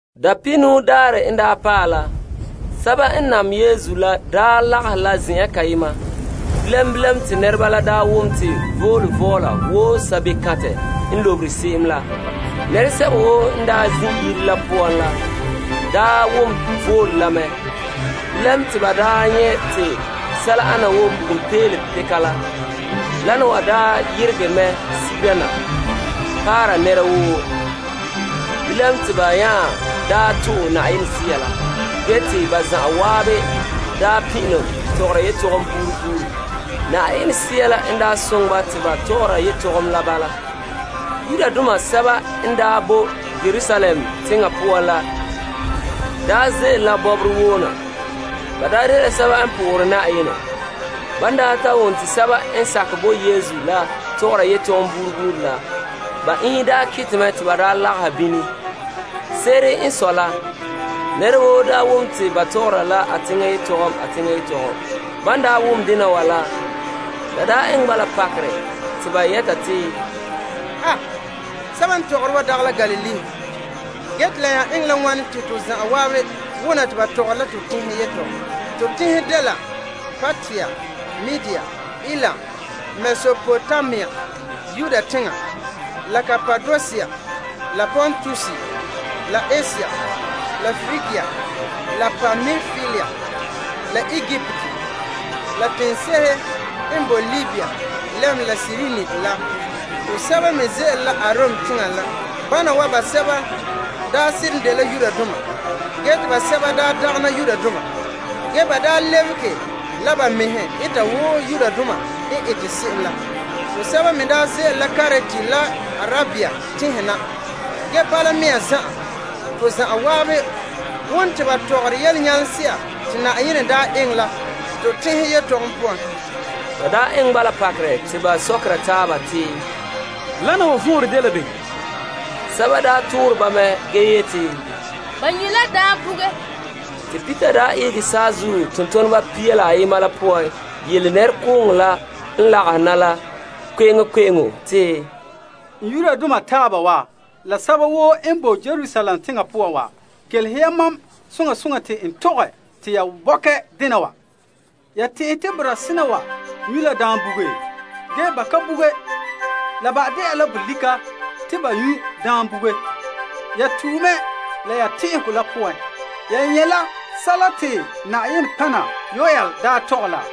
Dapihinuu Daarɛ la n daa paɛ la, sɛba n nam Yesu la lagahɛ la zen'an kayema. Bilam bilam te nɛreba la wom to voole vɔɔla wo sabebekantɛ n lobere se'em la. Nɛresɛba woo n zin' yire la poan la, wom voole la mɛ. Bilam te ba nyɛ' te sɛla ana wo bugum peelom peka la. Wana wa yeregɛ mɛ sigera na paara nɛra woo. Bilam te ba nya to'e Yenɛ Sea la, ge te ba zan'an daa pin'ilom tɔgɔra yetɔgom buuri buuri. Yenɛ Sea la n soŋɛ ba te ba tɔgɔra yetɔgom la bala. Yudoma sɛba n daa boe Yerusalem teŋa poan la ze'ele la bɔbɔre woo na. Ba dela sɛba n po'ohere Yenɛ. Ban ta wom te sɛba n sakɛ bo Yesu la tɔgɔre yetɔgom buuri buuri la, ba iinhe kete mɛ te ba daa lagahɛ bini. Se'ere n sɔe la nɛra woo wom te ba tɔgɔra la a teŋa yetɔgom, a teŋa yetɔgom. Ban wom dena wa la, la eŋɛ ba pakerɛ te ba yɛta te, Aba! Sɛba n tɔgɔre wana wa dagɛ la Galilee nɛreba? Ge te la eŋɛ la wane te to zan'an wona te ba tɔgɔra te teŋhe yetɔgom? To teŋhe dela Partia la Media la Elam la Mesopotamia la Yudea la Kapadosia la Pontus la Asia la Prigia la Pampilia la Egipt, la teŋse'ehe n bo Libya lɛm Kirene la. Tosɛba me ze'ele la Arom teŋa na Bana wa basɛba seren dela Yudoma ge te basɛba te ba lebege la ba mɛhe dɛna Yudoma. Tosɛba me ze'ele la Krete la Arabia teŋhe na. Ge bala mea zan'an, te zan'an wom te ba tɔgɔra yelenyalema se'a te Yenɛ daa eŋɛ la, te teŋhe yetɔgom poan. La eŋɛ ba pakerɛ te ba sokera taaba te, Wana wa vɔnrɛ dela bem? Sɛba toore ba mɛ ge yeti, Ba nyu' la daam buge. Te Peter daa ihege saazuo tontoneba pia la ayema la poan yele nɛrekooŋɔ la n lagahɛ na la kpe'eŋkpe'eŋo te, N Yudoma taaba wa la sɛba woo n boe Yerusalem teŋa poan wa, kelehe ha mam soŋa soŋa te n tɔgɛ te ya bɔkɛ dena wa. Ya tɛn'ɛhɛ te boraa sena wa nyu' la daam buge, ge ba ka buge. La ba de'a la bolika te ba nyu' daam buge. Ya tue mɛ la ya tɛn'ɛhegɔ la poan. Ya nyɛ' la sɛla te nɔtɔgɔha Yoel daa tɔgɛ la.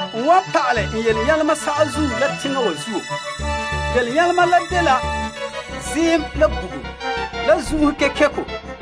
N wan pa'alɛ n nyalema saazuo ha, la teŋparɛ wa zuo. Ziim la bugum la zun'sɔbelegɔ.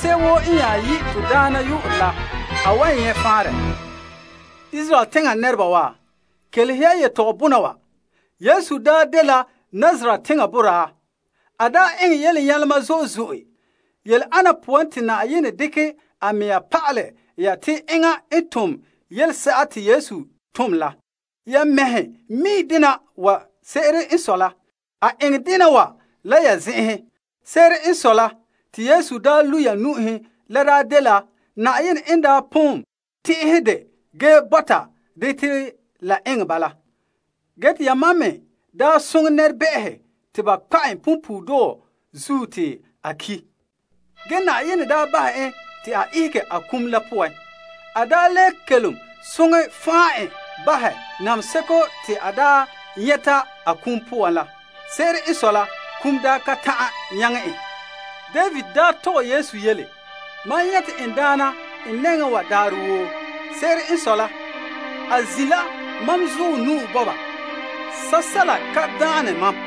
Se'em woo n dole Na'ayenɛ yu'urɛ la wan nyɛ' faanrɛ. Israel teŋa nɛreba wa, kelehe ya yetɔgɔbɔna wa. Yesu daa dela Nazaret teŋa boraa. A daa eŋɛ yelenyalema zo'e zo'e yele ana poan te Yenɛ dekɛ a mea pa'alɛ ya te enŋa n tom yelese'a te Yesu tom la. Ya mɛhe mi' dena wa. Se'ere n sɔe la, a eŋɛ dena wa la ya zen'enhe. Se'ere n sɔe te Yesu daa lu' ya nu'uhen daa dela Yenɛ n daa pon tɛn'ɛhɛ dɛ ge bɔta dɛ te la eŋɛ bala. Ge te yamam me daa soŋɛ nɛrebɛ'ɛhe te ba kpa' en punpuuredɔɔ zuo te a ki'. Ge Yenɛ daa bahɛ en te a ihege a kum la poan. A daa le kelom soŋɛ fan' en bahɛ nameheseko te a daa nyɛta a kum poan la. Se'ere n sɔe la, kum daa kan ta'an nyaŋɛ en. David daa tɔgɛ Yesu yele: Na'ayenɛ te mam dekɛ tolehe n nɛŋa daarɛ woo. Se'ere n sɔe la, enŋa n boe n zuɔ nu'o bɔba. Sɛla ka boe wan bike mam.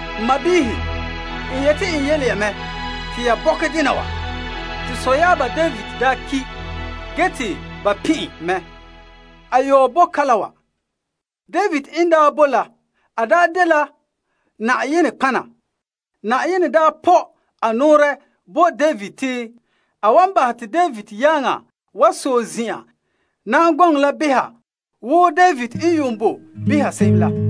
N sɔɔnrɔ, n yete n yele ya mɛ te ya bɔkɛ dena wa soŋa. Te sɔyaaba David daa ki' ge te ba pin' en mɛ. Ge a yɔɔ boe kalam wa. David n daa boe la, a daa dela Yenɛ nɔtɔgɔha. Yenɛ daa pɔ' a nɔɔrɛ bo David te a wan bahɛ te David yaaŋa wa sɔe zin'an na'am gɔŋɔ la behera wo David n yuun boe behera se'em la.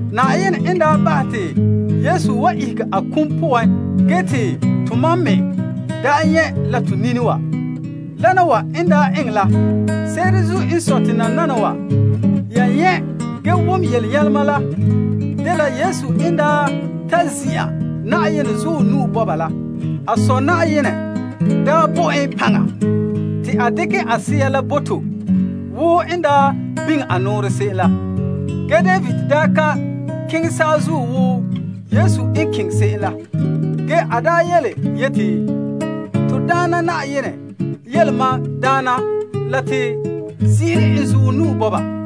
Yenɛ n daa bahɛ te Yesu wa ihege a kum poan ge te tomam me daa nyɛ' la to nini wa, wana wa n daa eŋɛ la. Se'ere n sɔe te nananawa, yan nyɛ' ge wom yelenyalema la, dela Yesu n daa ta zin'an Yenɛ zuɔ nu'o bɔba la, a Sɔ' Yenɛ daa bo en paŋa la te a dekɛ a Sea la bo tomam wo n daa biŋe a nɔɔrɛ la se'em la. Ge David daa ka keŋɛ saazuo wo Yesu n keŋɛ se'em la ge a daa yeti, Te Na'ayenɛ yele mam Daana la yeti, zin'ire n zuɔ nu'o wa na,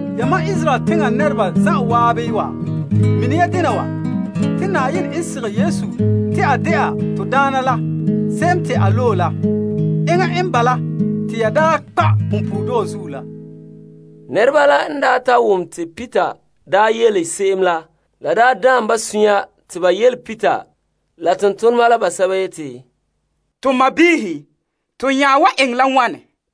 Yamam Israel teŋa nɛreba zan'an wa, mine ya dena wa: Te Yenɛ n sigɛ Yesu te a de'a to Daana la Se'em Te A Loe La. Enŋa n bala te ya daa kpa' punpuuredɔɔ zuo la. Nɛreba la daa n ta wom Peter n daa yele se'em la, la daan ba sunya mɛ te ba yele Peter la tontoneba basɛba la yeti, To sɔɔnrɔ, to nya wan eŋɛ la wane?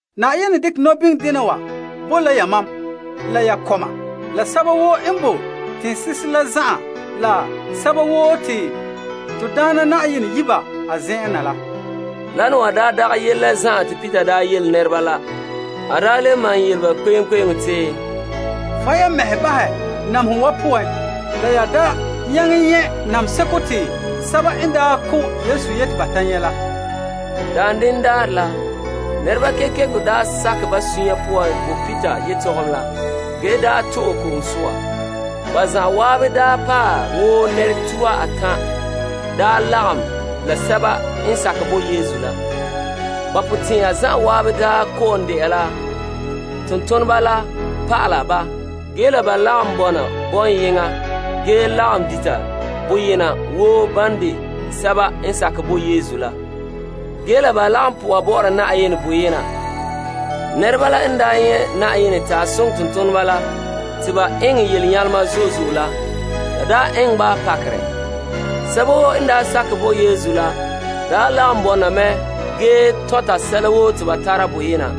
Yenɛ dekɛ nɔbiŋdena wa bo la yamam la ya kɔma la sɛba woo n boe teŋse'ehe la zan'an la sɛba woo te to Daana Yenɛ yi' ba a zen'en na la. Wana wa daa dagɛ yele la zan'an te Peter yele nɛreba la. A le malom yele ba kpe'eŋkpe'eŋo te, Fan' ya, ya mɛhe bahɛ namehegɔ wa poan la ya da nyaŋɛ nyɛ' nameheseko te sɛba n daa ko' Yesu yete ba nyɛ' la. Daanden daarɛ la, nɛreba kekeko sakɛ ba sunya poan bo Peter yetɔgom la ge to'e ko'om soa. Ba zan'an paɛ wo nɛra tuha atan' lagom la sɛba n sakɛ bo Yesu la. Ba potɛn'ɛra zan'an kɔ'ɔn de'a la tontoneba la pa'ala ba ge la ba lagom bɔna bɔŋyeŋɔ ge lagom dita boyena wo ban de sɛba n sakɛ bo Yesu la, ge la ba lagom po'oha bɔ'ɔra Yenɛ boyena. Nɛreba la n nyɛ' Yenɛ n daa soŋɛ tontoneba la te ba eŋɛ yelenyalema zo'e zo'e la, la eŋɛ ba pakerɛ mɛ. Sɛba woo n sakɛ bo Yesu la, lagom bɔna mɛ ge tɔnta sɛla woo te ba tara boyena.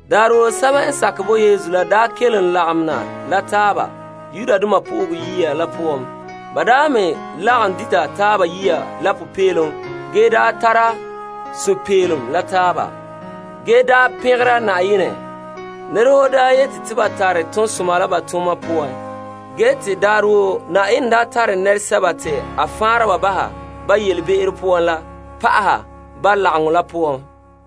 Daarɛ woo sɛba n sakɛ bo Yesu la kelom lagom na la taaba Yenɛ Yire la poan. Ba me lagom dita taaba yiya la popeelom ge tare sunpeelom la taaba, ge pɛngera Yenɛ. Nɛra woo yete te ba tare toonsoma la ba tooma poan. Ge te daarɛ woo Na'ayenɛ tare nɛresɛba te a faanra baha ba yelebe'ero poan la pa'aha ba lagaŋɔ la poan.